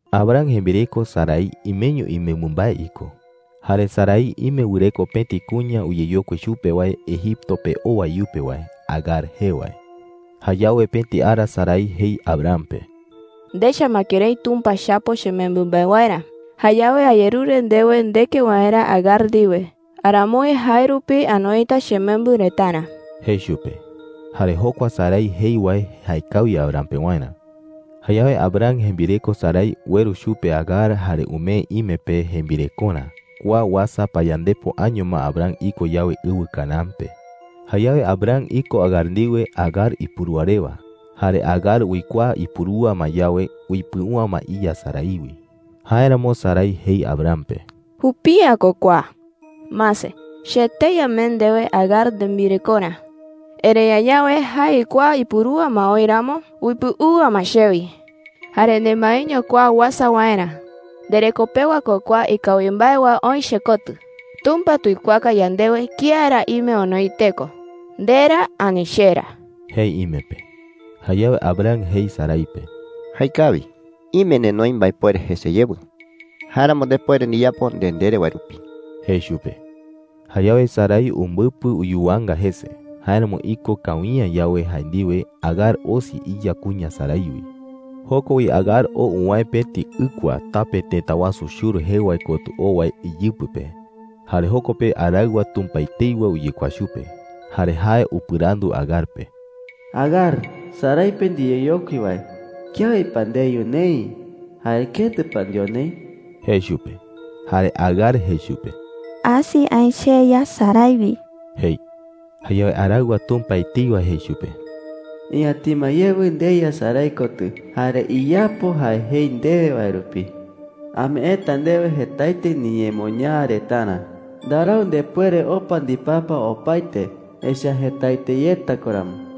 Abram jembireko Sarai imeño imembɨ mbae iko. Jare Sarai ime wɨreko pëti kuña uyeyokui chupe wae Egipto pe owa iyupe wae, Agar jee wae. Jayawe pëti ara Sarai jei Abram pe: “Ndecha ma kërái Tumpa chapo chemembɨ mbae waerä. Jayawe ayerure ndewe ndeke waerä Agar ndiwe. Aramoi jae rupi anoita chemembɨ retarä,” jei chupe. Jare jokua Sarai jei wae jaekawi Abram pewarä. Jayawe Abram jembireko Sarai ueru chupe Agar jare umee ime pe jembirekorä. Kua uasa payandepo año ma Abram iko yawe ɨwɨ Canaán pe. Jayawe Abram iko Agar ndiwe Agar ipurúa rewa. Jare Agar uikuaa ipurúa ma yawe, uipɨu’ä ma iya Sarai wi. Jáeramo Sarai jei Abram pe: “¡Jupi’ä ko kua!” jei. “Mase, che etei amee ndewe Agar nembirekorä. Erëi añawe jae uikuaa ipurúa ma oï ramo, uipɨu’ä ma chewi. ¡Jare nemaeño kua uasa waerä! ¡Ndereko pewa ko kua ikawi mbae wae oï chekotɨ! Tumpa tuikuaaka yandewe kía ra ime onoi teko – nde ra ani che ra,” jei ime pe. Jare Abram jei Sarai pe: “Jaekawi,” jei. “Ime nenoi mbaepuere jese yewɨ. Jáeramo ndepuere ndiyapo nde ndere wae rupi,” jei chupe. Jayawe Sarai umbɨpɨ uyuwanga jese. Jáeramo iko kawi’ä yawe jae ndiwe, Agar osi iya kuña Sarai wi. Joko wi Agar oo uwäe pëti ɨkua, tape tëta wasu Shur jee wae kotɨ oo wae iyɨpɨ pe. Jare joko pe araɨwa Tumpa etei wae uyekuaa chupe. Jare jae upɨrandu Agar pe: “Agar, Sarai pe ndiyeyokui wae, ¿kiawi pa ndeyu neï, jare ketɨ pa ndeo neï?” jei chupe. Jare Agar jei chupe: “Asi aï cheya Sarai wi,” jei. Jayawe araɨwa Tumpa etei wae jei chupe: “Iñatima yewɨ ndeya Sarai kotɨ jare iyapo jae jei ndewe wae rupi,” jei. “Ameeta ndewe jetaete niñemoñaa retarä. Ndarau ndepuere opa ndipapa opaete, echa’ä jetaete yeta ko ramo,” jei.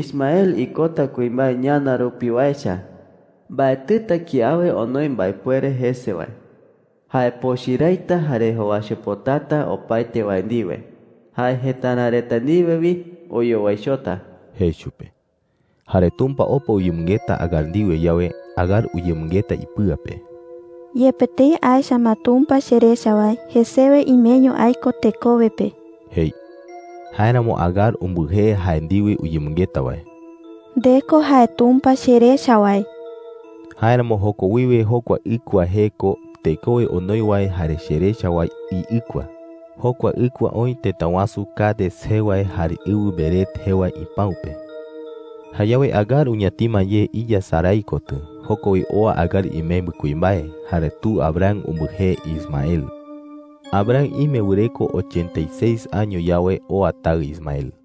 “Ismael ikota kuimbae ñana rupiwa echa. Mbaetɨta kiawe onoi mbaepuere jese wae. Jae pochɨ raita jare jowaichopotata opaete wae ndiwe. Jae jëtara reta ndiwe wi oyowaichota,” jei chupe. Jare Tumpa opa uyemɨngeta Agar ndiwe yawe, Agar uyemɨngeta ipɨa pe: “Yepe tëi aecha ma Tumpa cherecha wae, jesewe imeño aiko tekowe pe,” jei. Jáeramo Agar umbɨjee jae ndiwe uyemɨngeta wae: “Nde ko jae Tumpa cherecha wae.” Jáeramo joko wiwe jokua ɨkua jee ko: “Tekowe onoi wae jare cherecha wae iɨkua.” Jokua ɨkua oï tëta wasu Cades jee wae jare ɨwɨ Bered jee wae ipäu pe. Jayawe Agar uñatima ye iya Sarai kotɨ. Joko wi oa Agar imembɨ kuimbae, jare tu Abram umbɨjee Ismael. Abram ime wɨreko ochenta y seis año yawe, oa taɨ Ismael.